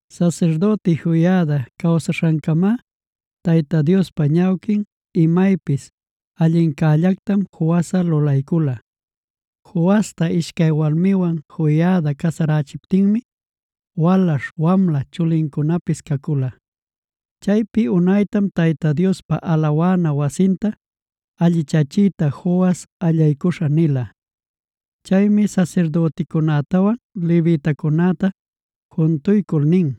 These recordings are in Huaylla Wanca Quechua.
Sasirdüti Joiada cawsaśhancamá Tayta Diospa ñawquin imaypis allincällactam Joasꞌa lulaycula. Joasta ishcay walmiwan Joiada casarächiptinmi walaśh wamla chulincunapis cacula. Chaypi unaytam Tayta Diospa alawana wasinta allichachiyta Joas allaycuśha nila. Chaymi sasirdüticunätawan levitacunäta juntuycul nin: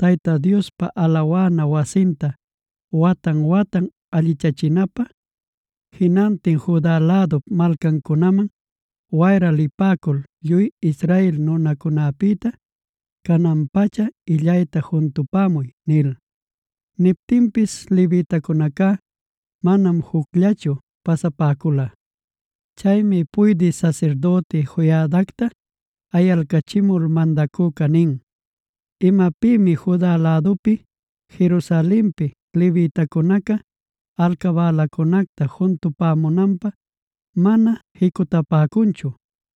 “Tayta Diospa alawana wasinta watan-watan allichachinapä, jinantin Juda lädup malcancunaman wayra lipäcul lluy Israel nunacunäpïta canan-pacha illayta juntupämuy” nil. Niptinpis levitacunacá manam jucllachu pasapäcula. Chaymi puydï sasirdüti Joiadacta ayalcachimul mandacüca nin: “¿Imapïmi Juda lädupi, Jerusalenpi levitacunaca alcabälacunäta juntupämunanpä mana jicutalanquichu?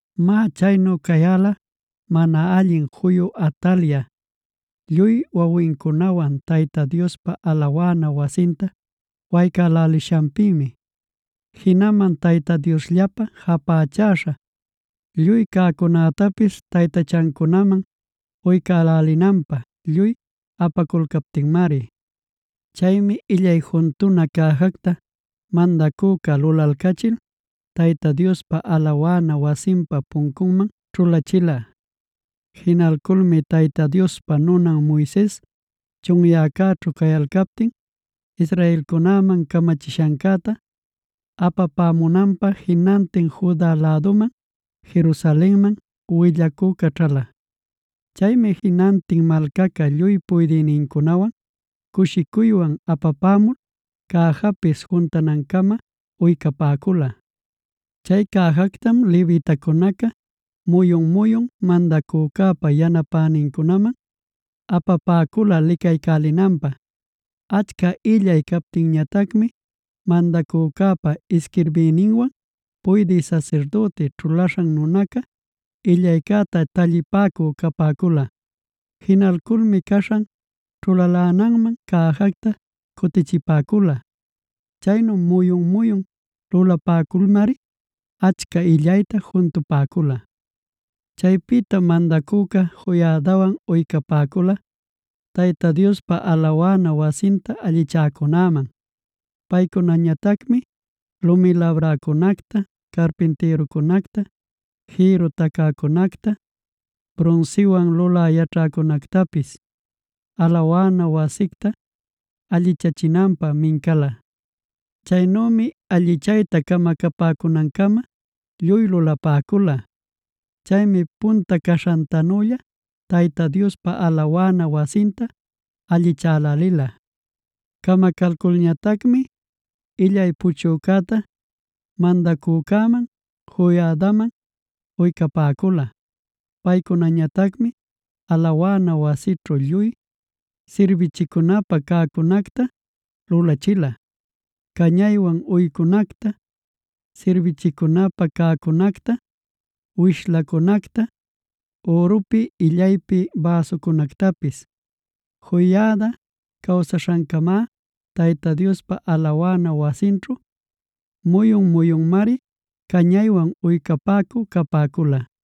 Má, chaynu cayäla mana allin juyu Atalia, lluy wawincunawan Tayta Diospa alawana wasinta waycälälishanpïmi. Jinaman Tayta Diosllapä japächaśha lluy cäcunätapis taytachancunaman uycälinanpä lluy apaculcaptinmari. Chaymi illay juntuna cäjacta mandacüca lulalcachil, Tayta Diospa alawana wasinpa puncunman ćhulachila. Jinalculmi Tayta Diospa nunan Moises, chunyäcäćhu cayalcaptin, israelcunäman camachishancäta apapämunanpa jinantin Juda läduman Jerusalenman willacü caćhala. Chaymi jinantin malcaca lluy puydïnincunawan cushicuywan apapämul cäjapis juntanancama uycapäcula. Chay cäjactam levitacunaca muyun-muyun mandacücäpa yanapänincunaman apapäcula licaycälinanpä. Achca illay captinñatacmi mandacücäpa isquirbïninwan puydï sasirdüti ćhulaśhan nunaca, illaycäta tallipäcü capäcula. Jinalculmi caśhan ćhulalänanman cäjacta cutichipäcula. Chaynu muyun-muyun lulapäculmari achca illayta juntupäcula. Chaypïtam mandacüca Joiadawan uycapäcula Tayta Diospa alawana wasinta allichäcunäman. Paycunañatacmi lumi labräcunacta, carpintïrucunacta, jïrru tacäcunacta, brunsiwan lulä yaćhäcunactapis alawana wasicta allichachinanpä mincala. Chaynümi allichayta camacapäcunancama lluy lulapäcula. Chaymi punta caśhantanülla Tayta Diospa alawana wasinta allichälälila. Camacalculñatacmi illay puchücäta mandacücäman, Joiadaman uycapäcula. Paycunañatacmi alawana wasićhu lluy sirbichicunapä cäcunacta lulachila: cañaywan uycunacta, sirbichicunapä cäcunacta, wishlacunacta, ürupi illaypi bäsucunactapis. Joiada cawsaśhancamá Tayta Diospa alawana wasinćhu muyun-muyunmari cañaywan uycapäcü capäcula.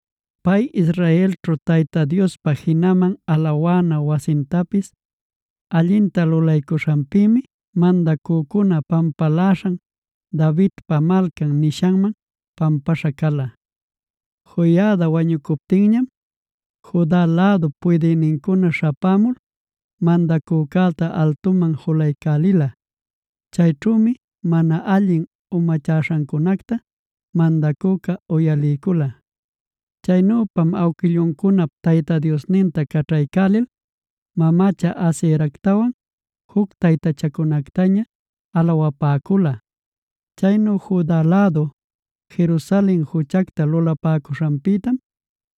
Pay Israelćhu Tayta Diospa jinaman alawana wasintapis allinta lulaycuśhanpïmi mandacücuna pampaläśhan Davidpa Malcan nishanman pampaśha cala. Joiada wañucuptinñam Juda lädup puydïnincuna śhapämul, mandacücäta altuman julaycälila. Chayćhümi mana allin umachäśhancunacta mandacüca uyaliycula. Chaynüpam awquilluncunap Tayta Diosninta caćhaycälil, mamacha Aseractawan juc taytachancunactaña alawapäcula. Chaynu Juda lädu, Jerusalen juchacta lulapäcuśhanpïtam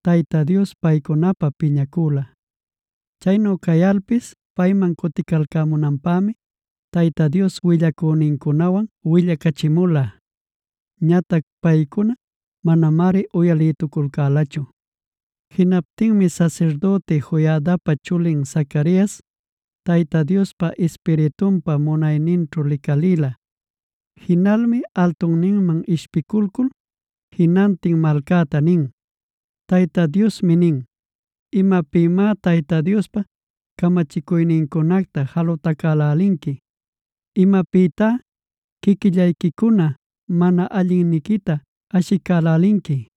Tayta Dios paycunapä piñacüla. Chaynu cayalpis payman cuticalcämunanpämi Tayta Dios willacünincunawan willacachimula. Ñatac paycuná manamari uyalïtuculcälachu. Jinaptinmi sasirdüti Joiadapa chulin Zacarias, Tayta Diospa Ispiritunpa munayninćhu licalïla. Jinalmi altunninman ishpiculcul jinantin malcäta nin: “Tayta Diosmi nin: ‘¿Imapïmá Tayta Diospa camachicuynincunacta jalutacälälinqui? ¿Imapïtá quiquillayquicuna mana allinniquita ashicälälinqui?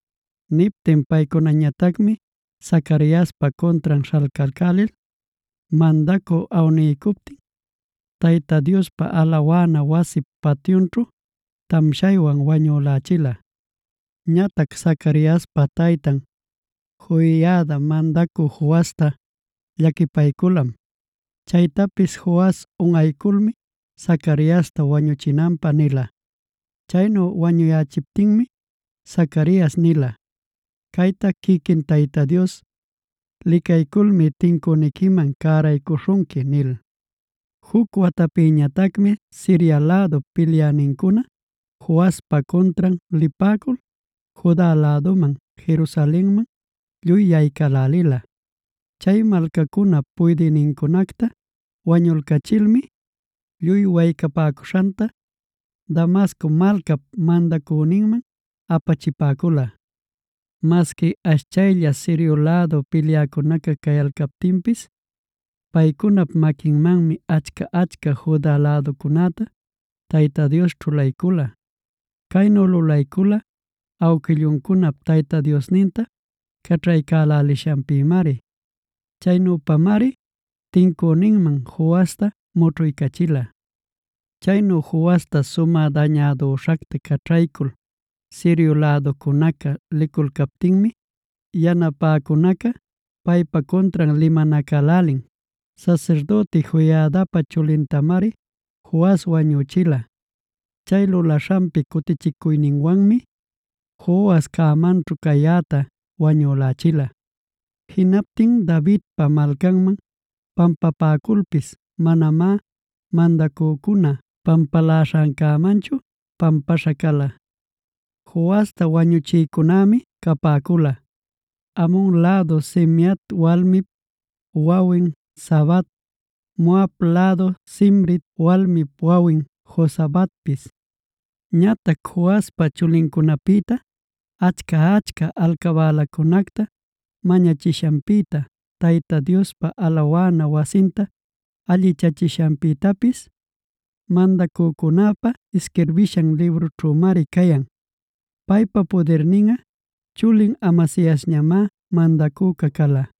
Niptin paycunañatacmi Zacariaspa cuntran śhalcalcälil, mandacüca awniycuptin Tayta Diospa alawana wasip patyunćhu, tamshaywan wañülächila. Ñatac Zacariaspa taytan Joiada mandacü Joasta llaquipayculam. Chaytapis Joas unꞌayculmi Zacariasta wañüchinanpä nila. Chaynu wañuyächiptinmi Zacarias nila: “Cayta quiquin Tayta Dios licayculmi tincüniquiman cäraycuśhunqui” nil. Juc watapïtañatacmi Siria lädup pilyänincuna Joaspa cuntran lipäcul, Juda läduman, Jerusalenman lluy yaycälälila. Chay malcacunap puydïnincunacta wañulcachilmi, lluy waycapäcuśhanta Damasco malcap mandacüninman apachipäcula. Masqui ashchaylla Sirio lädu pilyäcunaca cayalcaptinpis, paycunap maquinmanmi achca-achca Juda läducunäta Tayta Dios ćhulaycula. Caynu lulaycula awquilluncunap Tayta Diosninta caćhaycälälishanpïmari. Chaynüpamari tincüninman Joasta mućhuycachila. Chaynu Joasta sumä dañädüśhacta caćhaycul Sirio läducunaca liculcaptinmi, yanapäcunaca paypa cuntran limanacälälin. Sasirdüti Joiadapa chulintamari Joas wañüchila. Chay lulaśhanpi cutichicuyninwanmi Joas cämanćhu cayäta wañülächila. Jinaptin Davidpa Malcanman pampapäculpis manamá mandacücuna pampaläśhancämanchu pampaśha cala. Joasta wañuchïcunämi capäcula: Amon lädu Simeat walmip wawin Zabad, Moab lädu Simrit walmip wawin Jozabadpis. Ñatac Joaspa chulincunapïta, achca-achca alcabälacunacta mañachishanpïta, Tayta Diospa alawana wasinta allichachishanpïtapis mandacücunäpa isquirbishan librunćhümari cayan. Paypa pudirninꞌa chulin Amasiasñamá mandacüca cala.